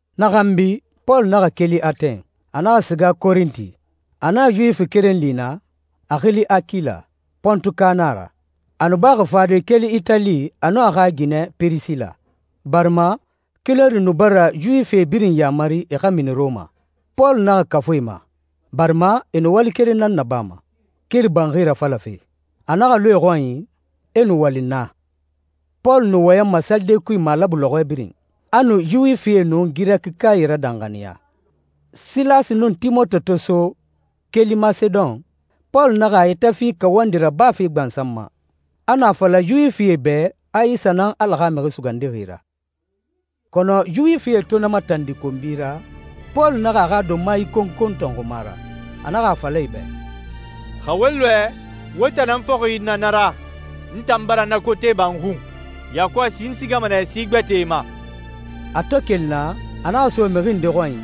Na xanbi, Pɔlu naxa keli Atɛn, a naxa siga Korinti. A naxa Yuwifi keren li naa, a xili Akila, Pontuka nan a ra. A nu baxi fade keli Itali a nun a xa ginɛ Pirisila, barima Kilɔdi nu bara Yuwifi birin yaamari e xa mini Rɔma. Pɔlu naxa kafu e ma, barima e nu wali keren nan nabama, kiri banxi rafalafe. A naxa lu e xɔnyi, e nu wali naa. Pɔlu nu wɔyɛnma salide kui malabu lɔxɔɛ birin. A nu Yuwifie nun Girɛkikae radanxaniya. Silasi nun Timote to so, keli Masedon, Pɔlu naxa a yɛtɛ fi kawandi rabafe gbansan ma. A nu a fala Yuwifie bɛ a Isa nan Ala xa Mixi Sugandixi ra. Kɔnɔ Yuwifie to na matandi konbi ra, Pɔlu naxa a xa donma ikonkon tɔnxuma ra, a naxa a fala e bɛ, «Xa wo lɔɛ, wo tan nan fɔxi na na ra. N tan bara na kote ba n xun. Yakɔsi n sigama nɛ si gbɛtɛe ma.» A to keli naa, a naxa so mixi nde xɔnyi,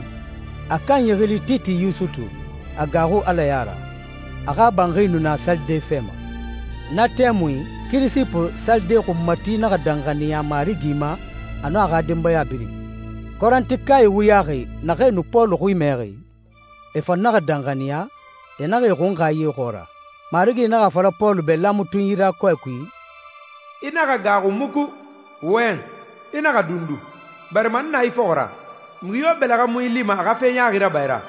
a kanyi xili Titi Yusutu, a gaaxu Ala ya ra. A xa banxi nu na salide fɛ ma. Na tɛmui, Kirisipu salide xunmati naxa danxaniya Marigi ma a nun a xa denbaya birin. Korintikae wuyaxi naxee nu Pɔlu xui mɛxi, e fan naxa danxaniya, e naxa e xunxa ye xɔɔra. Marigi naxa a fala Pɔlu bɛ laamatunyi ra kɔɛ kui, «I naxa gaaxu muku! Wɔyɛn! I naxa dundu, barima n na i fɔxɔ ra. Mixi yo bɛlɛxɛ mu i lima a xa fe ɲaaxi raba i ra,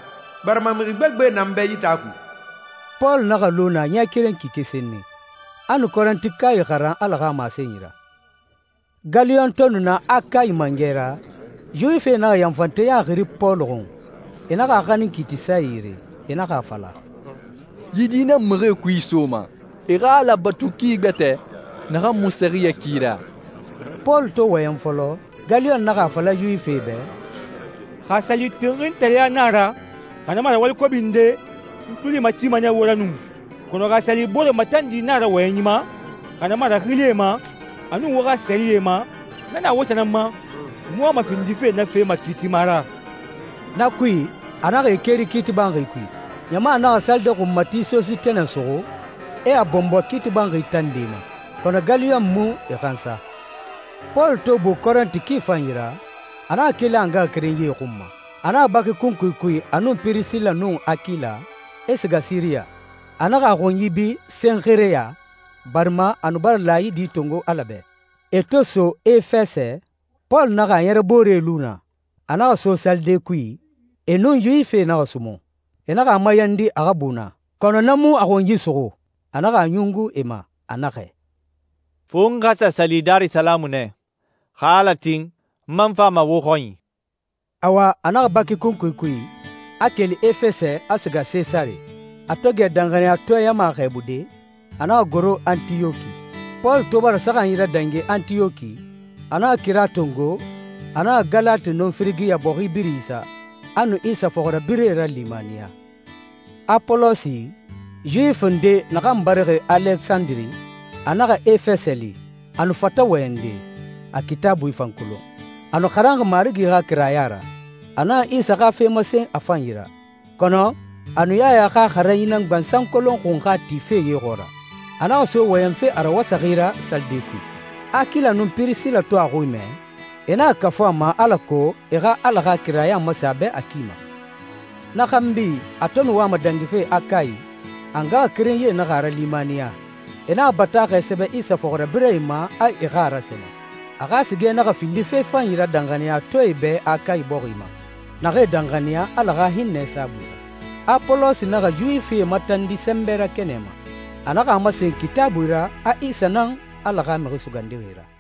barima mixi gbegbe na n bɛ yi taa kui.» Pɔlu naxa lu naa ɲɛ keren kike senni. A nu Korintikae xaran Ala xa masenyi ra. Galiyon to nu na Akayi mangɛ ra, Yuwifie naxa yanfanteya xiri Pɔlu xun, e naxa a xanin kiitisae yire. E naxa a fala, «Yi di nan mixie kui isoma e xa Ala batu ki gbɛtɛ naxan mu sɛriyɛ ki ra.» Pɔlu to wɔyɛn fɔlɔ, Galiyon naxa a fala Yuwifie bɛ, «Xa a sa li tinxintareya na a ra, xa na mu a ra wali kobi nde, n n tuli matima nɛ wo ra nu, kɔnɔ xa a sa li boore matandi na a ra wɔyɛnyi ma, xa na mu a ra xilie ma, a nun wo xa sɛriyɛ ma, na na wo tan nan ma. N mu wama findife na fe makiitima ra.» Na kui, a naxa e keri kiiti banxi kui. Ɲama naxa salide xunmati Sositene suxu, e a bɔnbɔ kiiti banxi tande ma, kɔnɔ Galiyon mu e hansa. Pɔlu to bu Korinti ki fanyi ra, a naxa keli a ngaxakerenyie xun ma. A naxa baki kunkui kui a nun Pirisila nun Akila, e siga Siriya. A naxa a xunyi bi Senxereya, barima a nu bara laayidi tongo Ala bɛ. E to so Efɛsɛ, Pɔlu naxa a ɲɛrɛbooree lu naa. A naxa so salide kui, e nun Yuwifie naxa sumun. E naxa a mayandi a xa bu naa, kɔnɔ na mu a xunyi suxu. A naxa a ɲungu e ma. A naxɛ, «Fo n xa sa sali Darisalamu nɛ. Xa Ala tin, n man fama wo xɔnyi.» Awa, a naxa baki kunkui kui, a keli Efɛsɛ, a siga Sesare. A to gɛ danxaniyatɔɛ ɲama xɛɛbude, a naxa goro Antiyɔki. Pɔlu to bara saxanyi radangi Antiyɔki, a naxa kira tongo, a naxa Galati nun Firigiya bɔxi birin isa, a nu Isa fɔxirabirɛe ralimaniya. Apolosi, Yuwifi nde naxan barixi Alesandire, a naxa Efɛsɛ li. A nu fata wɔyɛnde, a Kitaabui fan kolon. A nu xaranxi Marigi xa kiraya ra. A naxa Isa xa fe masen a fanyi ra, kɔnɔ a nu Yaya xa xaranyi nan gbansan kolon xunxa tife ye xɔɔra. A naxa so wɔyɛnfe a rawasaxi ra salide kui. Akila nun Pirisila to a xui mɛ, e naxa kafu a ma alako e xa Ala xa kiraya masen a bɛ a ki ma. Na xanbi a to nu wama dangife Akayi, a ngaxakerenyie naxa a ralimaniya. E naxa bataaxɛ sɛbɛ Isa fɔxirabirɛe ma a e xa a rasɛnɛ. A xa sigɛ naxa findi fe fanyi ra danxaniyatɔɛe bɛ Akayi bɔxi ma, naxee danxaniya Ala xa hinnɛ saabui ra. Apolosi naxa Yuwifie matandi sɛnbɛ ra kɛnɛ ma, a naxa a masen Kitaabui ra a Isa nan Ala xa Mixi Sugandixi ra.